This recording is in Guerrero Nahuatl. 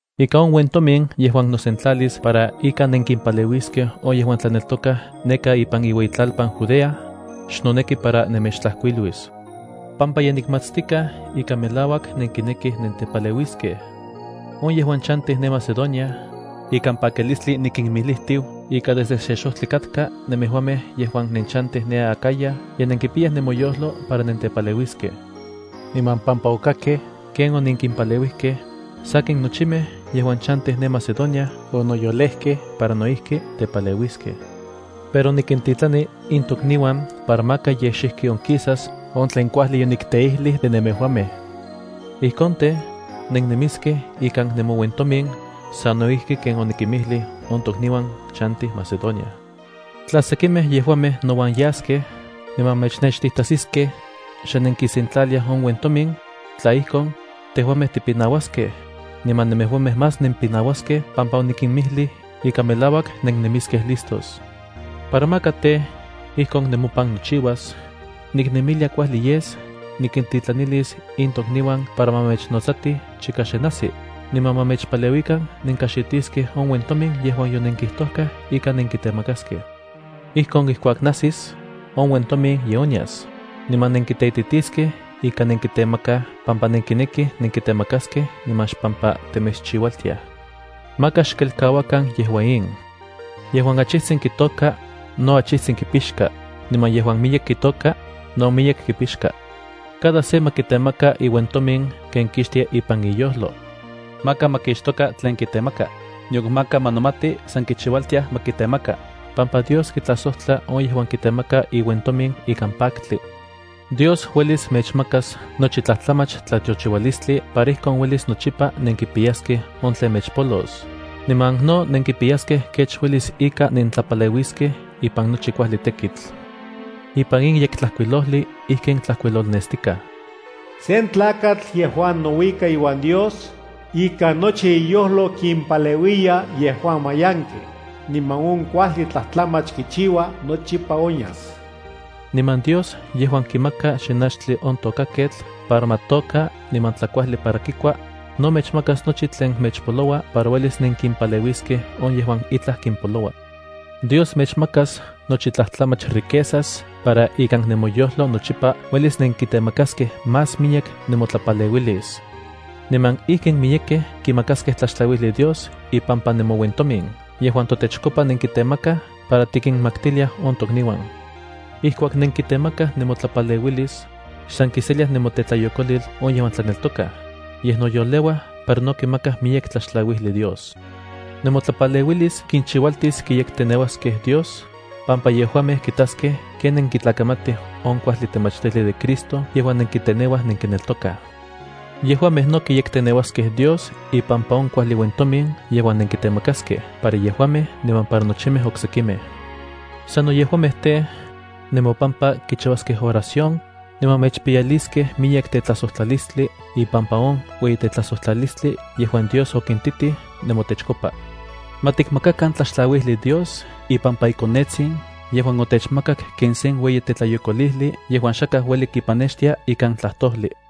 Ika on uentomin yejuan nosentlalis para ika nenkimpaleuiskej on yejuan tlaneltokaj neka ipan iueyitlalpan Judea, xnoneki para nemechtlajkuiluis, pampa ye nikmatstikaj ika melauak nenkinekij nentepaleuiskej. On yejuan chantij ne Macedonia, ikan pakilistli nikimijlijtiu ika desde se xojtli katka nemejuamej yejuan nenchantij ne Acaya ye nenkipiyaj nemoyojlo para nentepaleuiskej. Niman pampa okakkej ken onenkimpaleuijkej, sakin nochimej yejuan chantij ne Macedonia onoyolejkej para no ijki tepaleuiskej. Pero nikintitlani in tokniuan para maka yej xijki onkisas on tlen kuajli yonikteijlij de nemejuamej. Ijkon tej, nennemiskej ikan nemouentomin sano ijki ken onikimijlij on tokniuan chantij Macedonia. Tla sekimej yejuamej nouan yaskej niman mechnextijtajsiskej xe nenkisentlaliaj on uentomin, tla ijkon, tejuamej tipinauaskej, niman nemejuamej más nempinauaskej pampa onikimijlij ika melauak nennemiskej listos. Para maka tej, ijkon nemopan nochiuas, niknemilia kuajli yes nikintlajtlanilis in tokniuan para ma mechnotsatij chika xe najsi, niman ma mechpaleuikan nenkajxitiskej on uentomin yejuan yonenkijtojkej ika nenkitemakaskej. Ijkon ijkuak najsis, on uentomin ye onyas niman nenkiteititiskej ika nenkitemakaj pampa nenkinekij nenkitemakaskej niman xpampa temechchiualtiaj. Maka xkelkauakan yejua in. Yejuan achijtsin kitôka, no achijtsin kipixka, niman yejuan miyek kitôka, no miyek kipixka. Cada se ma kitemaka iuentomin ken kixtia ipan iyojlo. Maka ma kixtoka tlen kitemaka, nion maka ma nomati san kichiualtiaj ma kitemaka, pampa Dios kitlajsojtla on yejuan kitemaka iuentomin ikan paktli. Dios uelis mechmakas nochi tlajtlamach tlatiochiualistli para ijkon uelis nochipa nenkipiyaskej on tlen mechpolos, niman no nenkipiyaskej kech uelis ika nentlapaleuiskej ipan nochi kuajli tekitl. Ipan in Yektlajkuilojli ijkin tlajkuilolnestikaj: Sen tlakatl yejuan nouika iuan Dios, ikan nochi iyojlo kimpaleuiya yejuan mayankej, niman on kuajli tlatlamach kichiua nochipa onyas. Niman Dios yejuan kimaka xinachtli on tokaketl para ma tôka niman tlakuajli para kikua, no mechmakas nochi tlen mechpoloua para uelis nenkimpaleuiskej on yejuan itlaj kimpoloua. Dios mechmakas nochi tlajtlamach riquezas para ikan nemoyojlo nochipa uelis nenkitemakaskej más miyek nemotlapaleuilis. Niman ijkin miyekej kimakaskej tlaxtlauijli Dios ipampa nemouentomin yejuan totechkopa nenkitemakaj para tikinmaktiliaj on tokniuan. Ijkuak nenkitemakaj nemotlapaleuilis, xsan kiseliaj nemotetlayokolil on yejuan tlaneltokaj, yej noyoleua para no kimakaj miyek tlaxtlauijli Dios. Nemotlapaleuilis kinchiualtis kiyekteneuaskej Dios, pampa yejuamej kitaskej ken nenkitlakamatij on kuajli temachtijli de Cristo yejuan nenkiteneuaj nenkineltokaj. Yejuamej no kiyekteneuaskej Dios ipampa on kuajli uentomin yejuan nenkitemakaskej para yejuamej niman para nochimej oksekimej. Sano yejuamej tej, nemopampa kichiuaskej oración, niman mechpiyaliskej miyek tetlajsojtlalistli ipampa on ueyitetlajsojtlalistli yejuan Dios okintitij nemotechkopa. Ma tikmakakan tlaxtlauijli Dios ipampa iKonetsin yejuan otechmakak ken sen ueyi tetlayokolijli yejuan xakaj ueli kipanextia ikan tlajtojli.